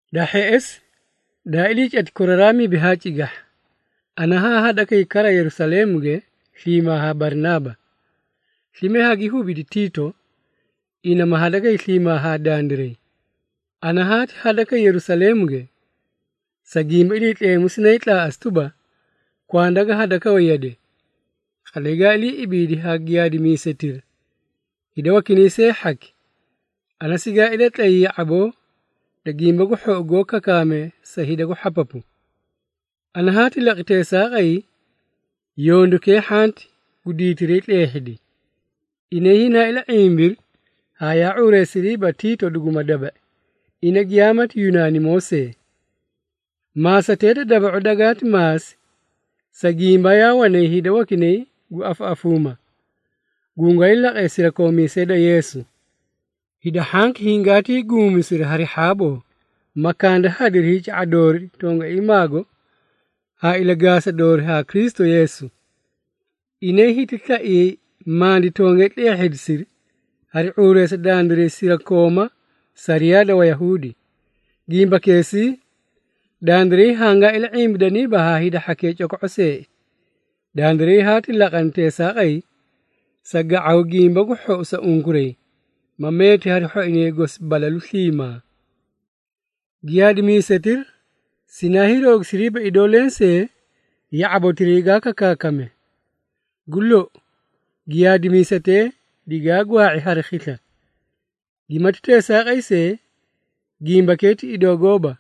Da hheꞌesi, daa ilii cati koraraa mibi haa cigahha, ana haa hadakay kara Yerusaleemuge sliimaa haa Barinaaba. Slime hagi hubidi Tiito, ina ma hadakay sliimaa haa dandiray. Ana haati hadakay Yerusaleemuge, sa gimba Iliitleemu sinaay tlaaꞌasi tuba, kwanda ga hadakawe yade. Qatlay gaa ilii ibiidi haa giyaadimiisetira, hida wakinay see hhaki, ana sigaa ilatlay ya⁄aboo da Gimba gu Hhou goó kakaamee sa hida gu hhapapu. Ana haati laqi teesaaqay, yondukee hhanti gu diitiray tleehhidi. Inay hinaa ila⁄imbiri haa yaa ⁄uureesiriiba Tiito duguma daba⁄i, ina giyaamati Yunaanimoo see. Maasatee da daba⁄u dagaati maasi, sa gimba yaa wanay hida wakinay gu afaꞌafuuma, gungwaay laqee sirakoomiisee da Yeesu. Hida hhanki hingaatii guumisiri hari hhaaboo, ma kandahadiri hiica⁄araa doori tongaiimaago haa ilagaasa doori haa Kristu Yeesu. Inay hiti slaiyay mandi tongee tleehhidisiri hari ⁄uureesa dandiray sirakooma sariyaa da Wayahuudi. Gimbakeesii, dandiray hangaa ila⁄imbidaniiba haa hida hhakee coko⁄o seei. Dandiray haati laqani teesaaqay, sa ga⁄aw Gimba gu Hhou sa unkuray, ma meeti hari hhoinay gosi balalu sliimaa. Giyaadimiisetira sinaa hiiroogisiriiba idoo lensee ya⁄abotiray gaa kakaakame. Gu lou, giyaadimiisetee digaa gwaa⁄i hari khisla. Gimati teesaaqay see, gimbakee ti idoo gooba,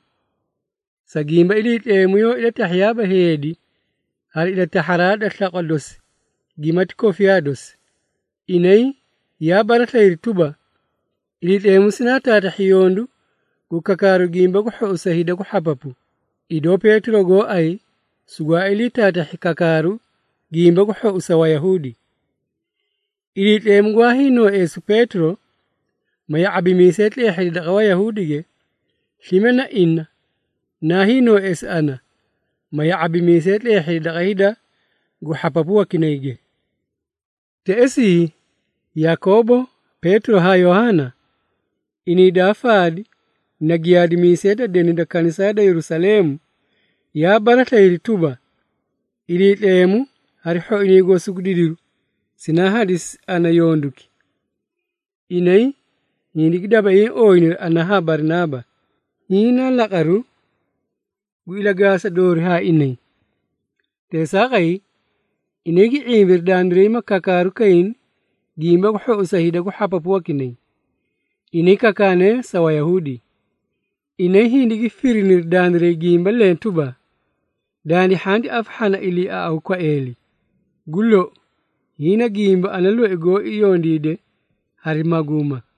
sa gimba Iliitleemu yoó ilatahhiyaaba heedi hari ilatahharaa da slaqwa dosi gimati kofiyaa dosi. Inay yaa baraslayiri tuba, Iliitleemu sinaati taatahhi yondu gu kakaaru Gimba gu Hhou sa hida gu hhapapu, idoo Peetiro gooay sugwaa ilii taatahhi kakaaru Gimba gu Hhou sa Wayahuudi. Iliitleemu gwaa hiinoóeesu Peetiro, ma ya⁄abimiisay tleehhidi daqa Wayahuudige, slime na ina naa hiinoóeesi ana, ma ya⁄abimiisay tleehhidi daqa hida gu hhapapu wakinayge. Teꞌesii, Yakoobo, Peetiro haa Yohaana, inay daa faadi na giyaadimiisee da deni da kanisaa da Yerusaleemu, yaa baraslayiri tuba, Iliitleemu hari hhoinay gosi gu didiru sinaa hadisi ana yonduki. Inay, hindigi dabaiĩ ooyiniri ana haa Barinaaba, hiĩ naa laqaru gu ilagaasa doori haa inay. Teesaaqay, inay gi ⁄imbiri dandiray ma kakaaru kayni Gimba gu Hhou sa hida gu hhapapu wakinay, inay kakaanee sa Wayahuudi. Inay hindigi firiniri dandiray gimba leẽ tuba, dandi hhanti afahhana iliiaꞌawu kwaeeli. Gu lou, hiĩ na gimba ana loi goó yondiide hari maguuma.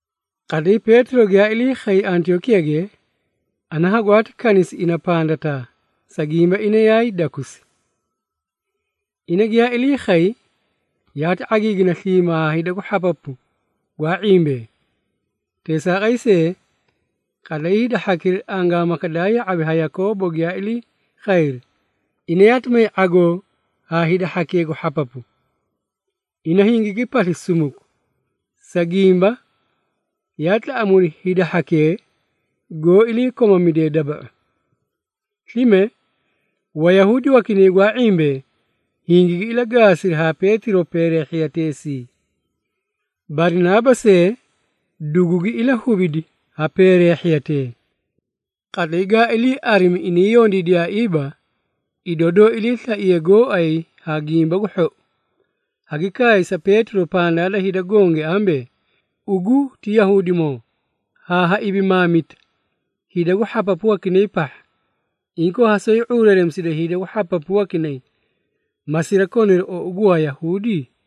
Qatlay Peetiro giyaa ilii khay Antiyookiyage, ana hagwaati kanisi ina pandataa, sa gimba, ina yaay dakusi. Ina giyaa ilii khay, yaati ⁄agiigina sliimaa haa hida gu hhapapu gwaa ⁄imbee. Teesaaqay see, qatlay hida hhakira angaamaka daa ya⁄abi ha Yakoobo giyaa ilii khayri, ina yaati may ⁄agoo haa hida hhakee gu hhapapu. Ina hingigi pasli sumuku, sa gimba, yaa tlaꞌamuudi hida hhakee, goó ilii komamidee daba⁄u. Slime, Wayahuudi wakinay gwaa ⁄imbee, hingigi ilagaasiri haa Peetiro peereehhiya teesii. Barinaaba see, dugugi ilahubidi ha peereehhiyatee. Qatlay gaa ilii arimi inay yondiidiyaaiiba, idoo doó iliislaiye gooay ha Gimba gu Hhou, hagi kaay sa Peetiro pandaa da hida gonge ambee, “Ugu ti Yahuudimoo, haa ha ibimaamita hida gu hhapapu wakinay pahha! Inkoo ha soꞌoyi ⁄uureeremisida hida gu hhapapu wakinay, ma sirakoniri ou gu Wayahuudi?”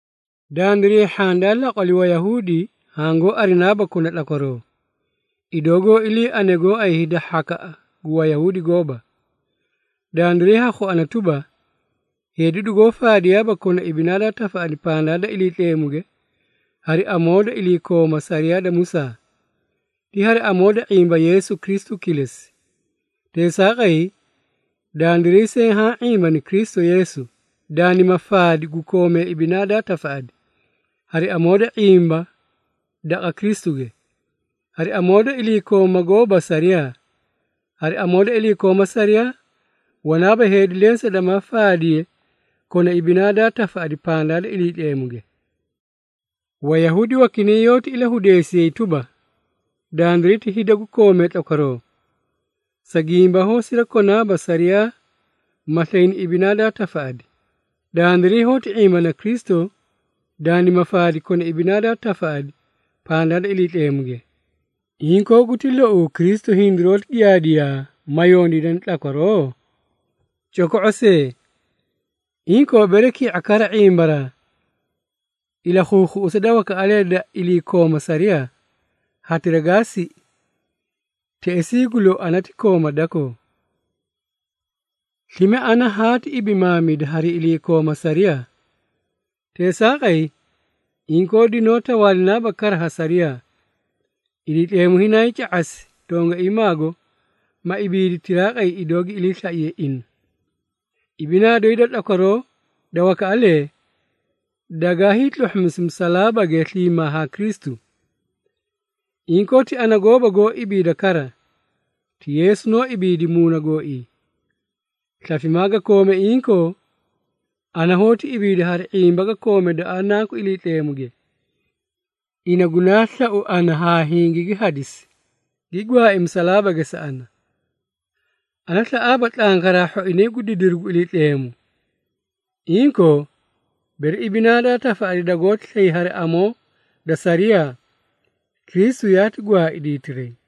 “Dandiray hhaã daa laqwali Wayahuudi hangoó arinaaba kona tlakwaroo, idoo goó iliiarine gooay hida hhakaꞌa gu Wayahuudi gooba. Dandiray ha khuana tuba, heedi dugoó faadiyaaba kona ibinaa daa tafaꞌadi pandaa da Iliitleemuge, hari amoo da iliikooma sariyaa da Musaa. Ti hari amoo da ⁄imba Yeesu Kristu kilesi. Teesaaqay, dandiray see haã ⁄imbani Kristu Yeesu, dandima faadi gu koomee ibinaa daa tafaꞌadi, hari amoo da ⁄imba daqa Kristuge, hari amoo da iliikooma gooba sariyaa. Hari amoo da iliikooma sariyaa, wanaaba heedi lensee damaa faadiye kona ibinaa daa tafaꞌadi pandaa da Iliitleemuge. Wayahuudi wakinay yoóti ilahudeesiyay tuba, dandiray ti hida gu koomee tlakwaroo, sa gimba hoó sirakonaaba sariyaa ma slayni ibinaa daa tafaꞌadi. Dandiray hoóti ⁄imbana Kristu dandima faadi kona ibinaa daa tafaꞌadi pandaa da Iliitleemuge. Inkoo, guti louu Kristu hindiroóti giyaadiyaa ma yondiidani tlakwaroo? Coko⁄o see! Inkoo, bere ki⁄a kara ⁄imbaraa ilakhuukhuꞌusa da wakaꞌalee da iliikooma sariyaa, hatira gaa siꞌi, teꞌesii gu lou ana ti kooma dakoo. Slime ana haati ibimaamida hari iliikooma sariyaa, teesaaqay, inkoo dinoó tawaalinaaba kara ha sariyaa. Iliitleemu hinaay ca⁄asi tongaiimaago, ma ibiidi tiraaqay idoo gi iliislaiye ina. Ibinaa doyi da tlakwaroo da wakaꞌalee dagaa hiitluhhumisi musalaabage sliimaa haa Kristu. Inkoo, ti ana gooba goó ibiida kara, ti Yeesu noó ibiidi muuna gooii. Slafimaa ga koome inkoo, ana hoóti ibiida hari ⁄imba ga koome daqa Nanku Iliitleemuge, ina gunaa slau ana haa hingigi hadisi, gi gwaai musalaabage sa ana. Ana slaꞌaaba tlankaraa hhoinay gu didiru gu Iliitleemu. Inkoo, bere ibinaa daa tafaꞌadi dagoóti slay hari amoo da sariyaa, Kristu yaati gwaai diitiray!”